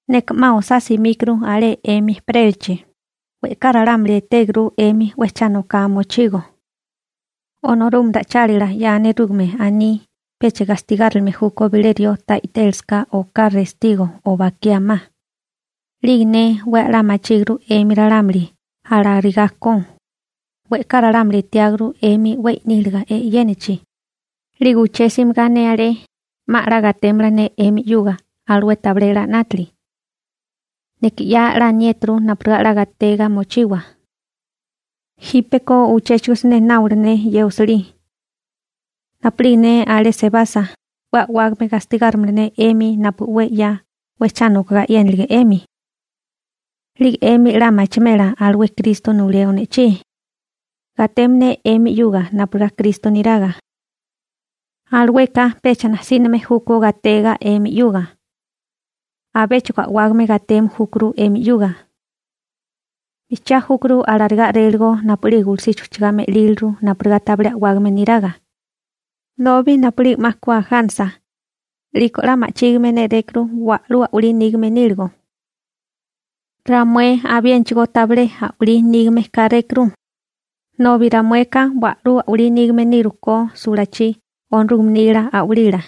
Neka 'ma osá simíkuru alé 'emi ejperélachi, we'ká ralámuli etéguru 'emi 'we cha noká mochigo. Onorúgame ra'ichálila 'ya nerúgame aní pecha gastigárilime júkó bilé rió ta i'télasaká oká restigo o bakiá ma, 'lige ne 'we a'lá machíguru 'emi ralámuli alarigá ko, we'ká ralámuli etiáguru 'emi 'we i'níliga e'yénachi, 'lige uché simigá ne alé, 'ma 'la gatémala ne 'emi 'yuga alué tabilé 'la 'nátili. Neka 'ya 'la aniéturu napurigá 'la gatega mochiwa. Jípeko uchéchigo siné nábola ne ye osilí. Napu'lige ne alé sebasa, 'we a'wágame gastigárimala ne 'emi napu 'we 'ya 'we cha nokogá e'yénilige 'emi. 'Lige 'emi 'la machimela alué Kristo nuleo ne'chí. Gateme ne 'emi 'yuga napurigá Kristo niraga. Alueka pecha najsíname júkó gatega 'emi 'yuga. Abéchigo a'wágame gateme júkuru 'emi 'yuga. Bijchiá júkuru alarigá a'réligo napu'lige gulusichi ujchagá me'líliru napurigá tabilé a'wágame niraga, nobi napu'lige 'ma ku ajánasa, 'liko 'la ma'chígime nérékuru wa'lú a'walí nígame níligo. Ramué abiénachigó tabilé a'walí nígame kárékuru, nobi ramueka wa'lú a'walí nígame niru ko sulachí Onorúgame nila a'walila,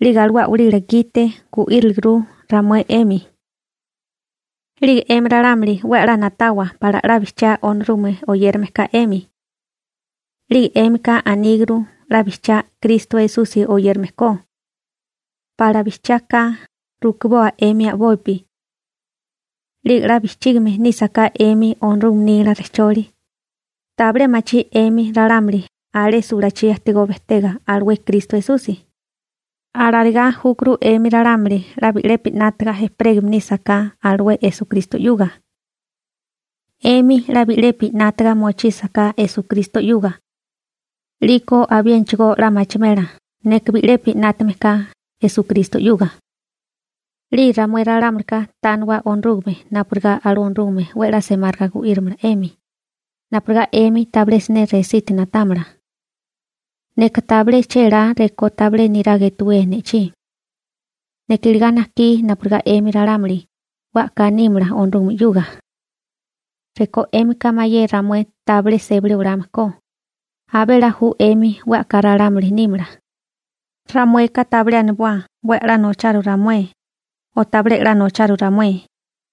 'lige alué a'walila gite gu'íriliguru ramué 'emi. 'Lige 'emi ralámuli 'we 'la na'tawa pala 'la bijchiá Onorúgame oyérame ka 'emi. 'Lige 'émika aníguru 'la bijchiá Kristo Esusi oyérame ko. Pala 'la bijchiá ka, rukiboa 'emi a'bopi. 'Lige 'la bijchígime nísaká 'emi Onorúgame nila rejcholi, ¿tabilé machí 'emi ralámuli alé sulálachi ajtigó bejtega alué Kristo Esusi? Alarigá júkuru 'emi ralámuli 'la bi'lepi 'nátaga ejperégame nísaká alué Esukristo 'yuga. 'Emi 'la bi'lepi 'nátaga mochísaká Esukristo 'yuga 'liko abiénachigó 'la machimela neka bi'lepi 'nátame ka Esukristo 'yuga. 'Lige ramué ralámulika tániwa Onorúgame napurigá alué Onorúgame 'we a'lá semáriga gu'írimala 'emi, napurigá 'emi tabilé siné resiti na'támala. Neka tabilé chélá rekó tabilé niraga etuwíe ne'chí. Neka iligá najkí napurigá 'emi ralámuli 'we a'ká nímala Onorúgame 'yuga. Rekó 'émika mayé ramué tabilé sébali olame ko, abé 'la ju 'emi 'we a'ká ralámuli nímala. Ramueka tabilé aniboa 'we a'lá nocharu ramué o tabilé 'la nocharu ramué,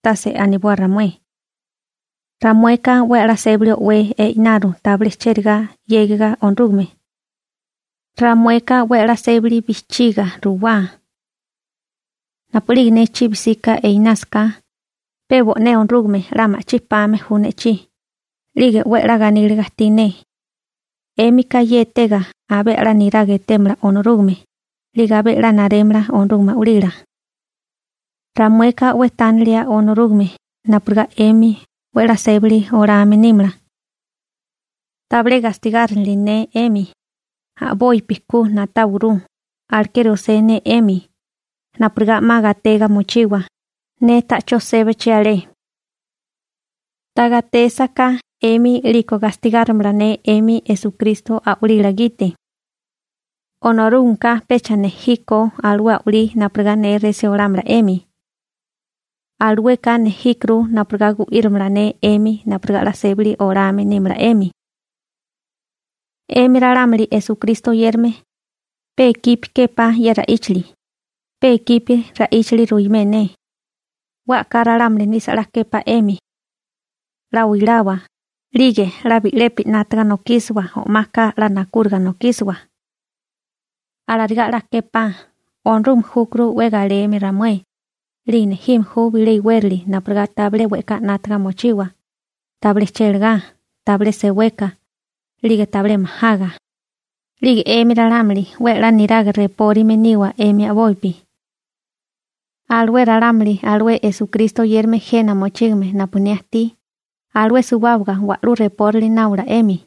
tase aniboa ramué. Ramueka 'we a'lá sébali o'wé e'inaru tabilé chérigá 'yégiwa Onorúgame. Ramueka 'we a'lá sébali bijchiga ruwá. Napu'lige ne chibi 'sika einásaká, pe bo'né Onorúgame 'la ma'chí pame ju ne'chí, 'lige 'we 'la ganíliga ajtí ne. 'Émika ye etega abé a'lá niraga etémala Onorúgame 'lige abé 'la narémala Onorúgame a'walila. Ramueka 'we tánilia Onorúgame napurigá 'emi 'we 'la sébali olame nímala. Tabilé gastigárinili ne 'emi, a'bopi ku na'táwaguru. Alekeri osé ne 'emi, napurigá 'ma gatega mochiwa, ne ta'chó sébachi alé. Ta gatésaká 'emi 'liko gastigárimala ne 'emi Esukristo a'walila gite. Onorúgameka pecha nejí ko alué a'walí napurigá ne resí olámala 'emi. Alueka nejíkuru napurigá gu'írimala ne 'emi napurigá 'la sébali olame nímala 'emi. 'Emi ralámuli Esukristo oyérame, pe ikipi képá ye ra'íchali, pe ikipi ra'íchali ruimé ne, 'we a'ká ralámuli nisa 'la képá 'emi. 'La oilawa, 'lige 'la bi'lepi 'nátaga nokísiwa o'maka 'la nakúriga nokísiwa. Alarigá 'la képá. Onorúgame júkuru 'we galeme ramué, 'lige nejime ju bilé iwérali napurigá tabilé we'ká 'nátaga mochiwa, tabilé chélagá, tabilé seweka, 'lige tabilé majaga. 'Lige 'emi ralámuli 'we a'lá niraga repórime niwa 'emi a'bopi. Alué ralámuli alué Esukristo oyérame jena mochígame napu ne ajtí, alué suwábaga wa'lú reporali nábola.